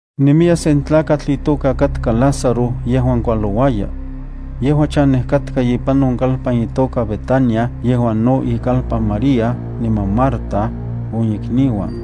Nemiya sen tlakatl itoka katka Lázaro yejuan kualouaya. Yejua chanej katka ipan on kalpan itoka Betania yejuan no ikalpan María niman Marta, on ikniuan.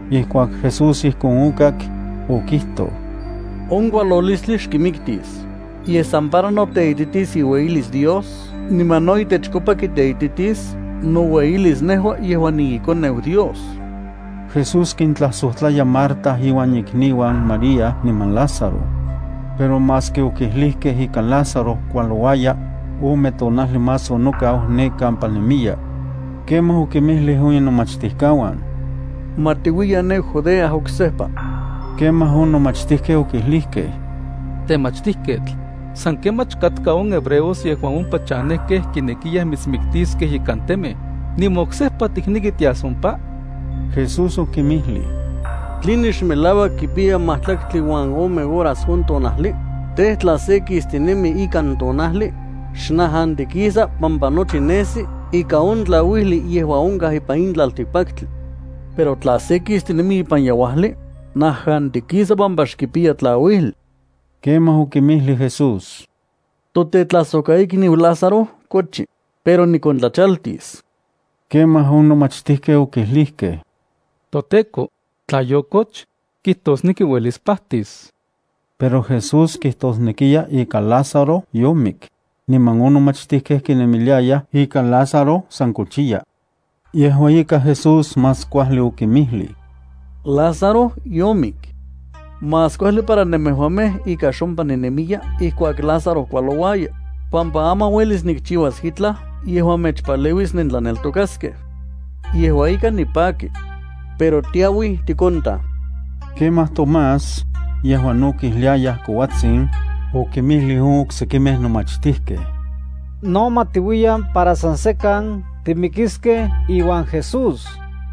Ijkuak Jesús ijkon okak, okijtoj: —On kualolistli xkimiktis, yej san para noteititis iueyilis Dios niman no itechkopa kiteititis noueyilis nejua yejuan niiKoneu Dios. Jesús kintlajsojtlaya Marta inuan ikniuan María niman Lázaro. Pero maski okijlijkej ika Lázaro kualouaya, ome tonajli más onokau ne kampa nemiya. Kemaj okinmijlij on inomachtijkauan: —Ma tiuiyan ne Judea oksejpa. Kemaj on nomachtijkej okijlijkej: —Temachtijketl, san kemach katka on hebreos yejuan ompa chanejkej kinekiyaj mitsmiktiskej ikan temej, ¿niman oksejpa tikneki tias ompa? Jesús okinmijlij: —¿Tline xmelauak kipiya majtlaktli uan ome horas on tonajli? Tej, tla se kistinemi ikan tonajli, xnajantikisa pampa nochi nesi ikan on tlauijli yejuan onkaj ipan in tlaltikpaktli. Pero tla se kistinemi ipan yeuajli, najantikisa pampa xkipiya tlauijli. Kemaj okinmijlij Jesús: —Totetlajsojkaikniu Lázaro kochi, pero nikontlachaltis. Kemaj on nomachtijkej okijlijkej: —ToTEKO, tla yokoch, kijtosneki uelis pajtis. Pero Jesús kijtosnekiya ika Lázaro yomik, niman on nomachtijkej kinemiliayaj ika Lázaro san kochiya. Yejua ika Jesús más kuajli okinmijlij: —Lázaro yomik. Más kuajli para nemejuamej ika xompa ninemiya ijkuak Lázaro kualouaya, pampa aman uelis nikchiuas itlaj yejuan mechpaleuis nentlaneltokaskej. Yejua ika nipaki. Pero ma tiauiyan tikontaj. Kemaj Tomás, yejuan no kijliayaj kouatsin, okinmijlij on oksekimej nomachtijkej: —No ma tiuiyan para san sekan timikiskej iuan Jesús.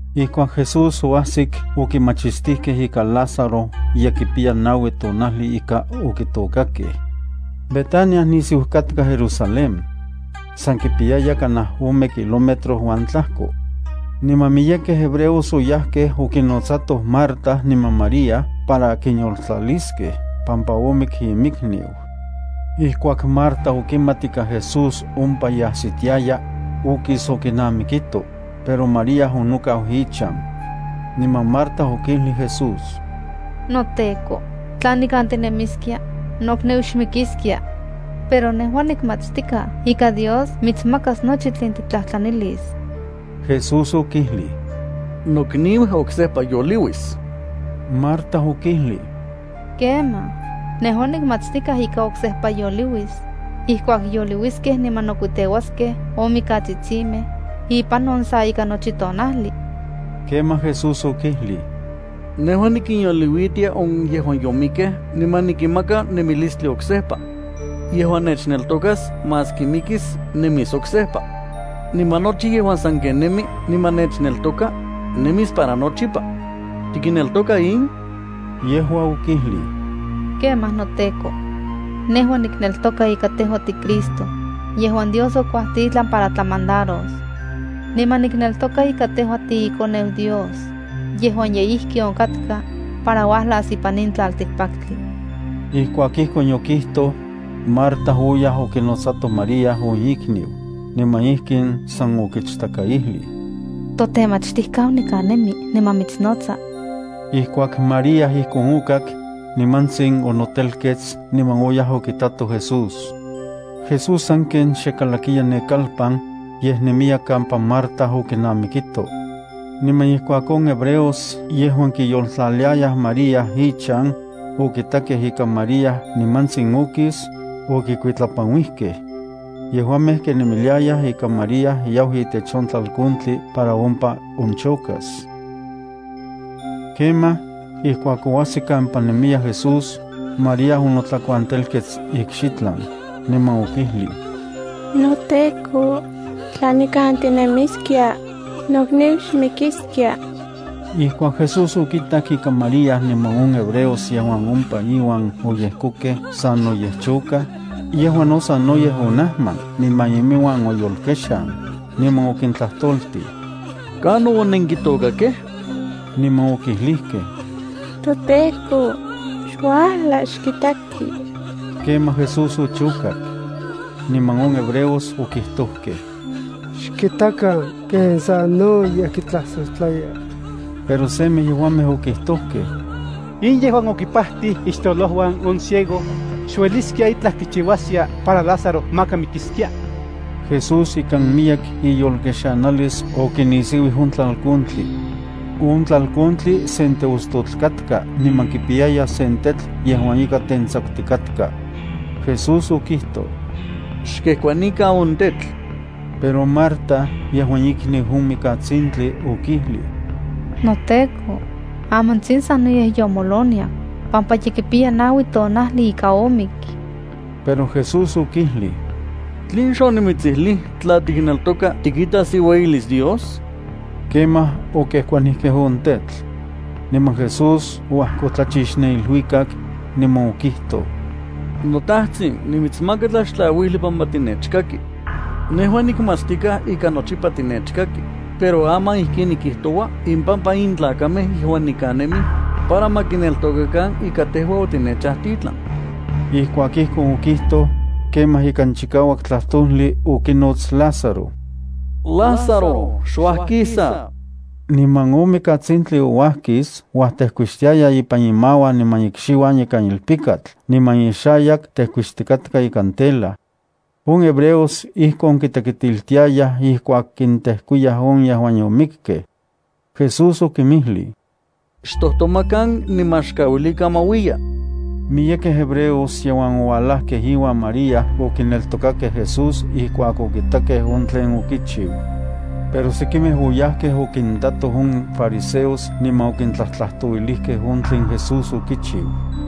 Ijkuak Jesús oajsik okimachistijkej ika Lázaro ye kipiya naui tonajli ika okitôkakej. Betania nisiu katka Jerusalén. San kipiyaya kanaj ome kilómetro uan tlajko, niman miyekej hebreos oyajkej okinnotsatoj Marta niman María para kinyoltlaliskej pampa omik inmikniu. Ijkuak Marta okimat ika Jesús ompa ye ajsitiaya, okis okinamikito, pero María onokau inchan. Niman Marta okijlij Jesús: —NoTEKO, tla nikan tinemiskia, nokniu xmikiskia. Pero nejua nikmatstikaj ika Dios mitsmakas nochi tlen tiktlajtlanilis. Jesús okijlij: —Mokniu oksejpa yoliuis. Marta okijlij: —Kemaj, nejua nikmatstikaj ika oksejpa yoliuis ijkuak yoliuiskej niman nokuiteuaskej on mikatsitsimej ipan on sa ika nochi tonajli. Kemaj Jesús okijlij: —Nejua nikinyoliuitia on yejuan yomikkej niman nikinmaka nemilistli oksejpa. Yejuan nechneltokas, maski mikis, nemis oksejpa. Niman nochi yejuan sanken nemi niman nechneltoka, nemis para nochipa. ¿Tikneltoka in? Yejua okijlij: —Kemaj noTEKO. Nejua nikneltoka ika tejua tiCristo yejuan Dios okuajtitlan para tlamandaros. Niman nikneltoka ika tejua tiiKoneu Dios yejuan ye ijki onkatka para uajlas ipan in tlaltikpaktli. Ijkuak ijkon yokijtoj, Marta oyaj okinotsato María on ikniu, niman ijkin san okichtakaijlij: —On Temachtijketl nikan nemi niman mitsnotsa. Ijkuak María ijkon okak, nimantsin onotelkets niman oyaj okitato Jesús. Jesús sanken xe kalakiya ne kalpan, yej nemiya kampa Marta okinamikito. Niman ijkuak on hebreos yejuan kiyoltlaliayaj María ichan okitakej ika María nimantsin okis, okikuitlapanuijkej. Yejuamej kinemiliayaj ika María yau itech on tlalkontli para ompa onchokas. Kemaj, ijkuak oajsik kampa nemiya Jesús, María onotlakuantelkets ikxitlan, niman okijlij: —NoTEKO, tla nikan tinemiskia, nokniu xmikiskia. Ijkuak Jesús okitak ika María niman on hebreos yejuan ompa iuan oyejkokej sanoyej chokaj, yejua no sanoyej onajman niman iminuan oyolkexan, niman okintlajtoltij: —¿Kanon onenkitôkakej? Niman okijlijkej: —ToTEKO, xuajla xkitaki. Kemaj Jesús ochokak. Niman on hebreos okijtojkej: —Xkitakan ken sanoyej kitlajsojtlaya. Pero semej yejuamej okijtojkej: —In yejuan okimpajtij ixtololojuan on ciego, ¿xueliskia itlaj kichiuaskia para Lázaro maka mikiskia? Jesús ikan miyek iyolkexanalis okinisiuij on tlalkontli. On tlalkontli sen teostotl katka niman kipiyaya sen tetl yejuan ika tentsakutikatka. Jesús okijtoj: —Xkejkuanikan on tetl. Pero Marta yejuan ikniu on mikatsintli, okijlij: —NoTEKO, amantsin sanoyej yomoloniak pampa ye kipiya naui tonajli ika omik. Pero Jesús okijlij: —¿Tlen xonimitsijlij tla titlaneltoka tikitas iueyilis Dios? Kemaj okejkuanijkej on tetl. Niman Jesús oajkotlachix ne iluikak, niman okijtoj: —NoTajtsin, nimitsmaka tlaxtlauijli pampa tinechkaki. Nejua nikmatstikaj ika nochipa tinechkaki, pero aman ijkin nikijtoua impampa in tlakamej yejuan nikan nemij, para ma kineltokakan ika tejua otinechajtitlan. Ijkuak ijkon okijtoj, kemaj ikan chikauak tlajtojli okinots Lázaro: —¡Lázaro, xuajkisa! Niman on mikatsintli ouajkis uajtejkuixtiaya ipan imauan niman ikxiuan ikan ilpikatl niman ixayak tejkuixtikatka ikan tela. On hebreos ijkon kitekitiltiayaj ijkuak kintejkuiyaj on yejuan yomikkej. Jesús okinmijlij: —Xtojtomakan niman xkauilikan ma uiya. Miyekej hebreos yejuan oualajkej iuan María okineltokakej Jesús ijkuak okitakej on tlen okichiu. Pero sekimej oyajkej okintatoj on fariseos niman okintlajtlajtouilijkej on tlen Jesús okichiu.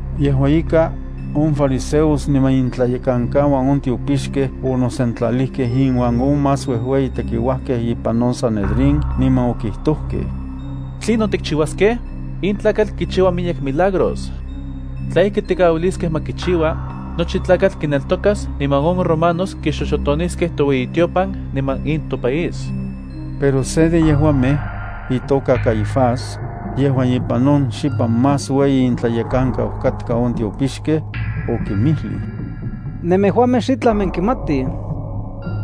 Yejua ika, on fariseos niman intlayekankauan on tiopixkej onosentlalijkej inuan on más uejueyi tekiuajkej ipan on sanedrín niman okijtojkej: —¿Tlinon tikchiuaskej? In tlakatl kichiua miyek milagros. Tla ijki tikauiliskej ma kichiua, nochi tlakatl kineltokas niman on romanos kixoxotoniskej toueyitiopan niman in topaís. Pero se de yejuamej, itoka Caifás, yejuan ipan on xipan más ueyi intlayekankau katka on tiopixkej, okinmijlij: —Nemejuamej xitlaj nenkimatij.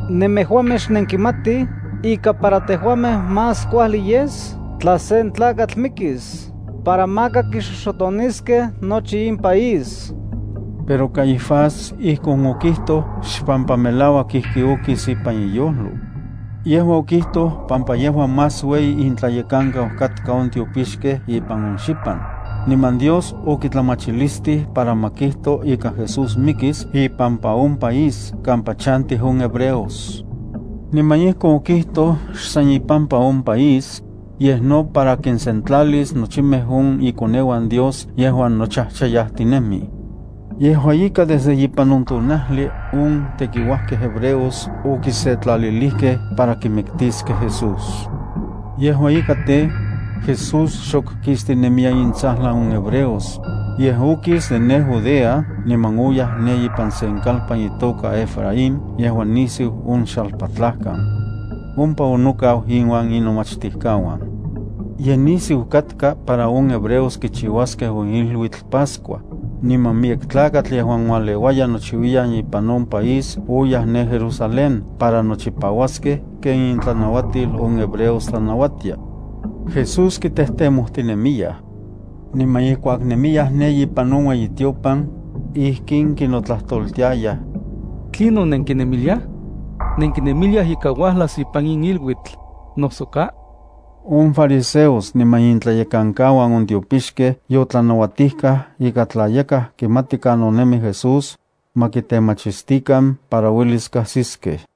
Nemejuamej xnenkimatij ika para tejuamej más kuajli yes tla sen tlakatl mikis para maka kixoxotoniskej nochi in país. Pero Caifás ijkon okijtoj xpampa melauak ijki okis ipan iyojlo. Yejua okijtoj pampa yejua más ueyi intlayekankau katka on tiopixkej ipan on xipan, niman Dios okitlamachilistij para ma kijto ika Jesús mikis ipampa on país kampa chantij on hebreos. Niman ijkon okijtoj xsan ipampa on país, yej no para kinsentlalis nochimej on ikoneuan Dios yejuan nochajchayajtinemij. Yejua ika desde ipan on tonajli on tekiuajkej hebreos okisetlalilijkej para kimiktiskej Jesús. Yejua ika tej, Jesús xok kistinemiya intsajlan on hebreos, yej okis de ne Judea niman oyaj ne ipan sen kalpan itoka Efraín yejuan nisiu on xalpatlajkan. Ompa onokau inuan inomachtijkauan. Ye nisiu katka para on hebreos kichiuaskej on iluitl Pascua, niman miyek tlakatl yejuan ualeuayaj nochiuiyan ipan on país oyaj ne Jerusalén para nochipauaskej ken intlanauatil on hebreos tlanauatia. Jesús kitejtemojtinemiyaj. Niman ijkuak ye nemiyaj ne ipan on ueyitiopan, ijkin kinotlajtoltiayaj: —¿Tlinon nenkinemiliaj? ¿Nenkinemiliaj ika uajlas ipan in iluitl, noso ka? On fariseos niman intlayekankauan on tiopixkej yotlanauatijkaj ika tla yakaj kimati kanon nemi Jesús, ma kitemachistikan para uelis kajsiskej.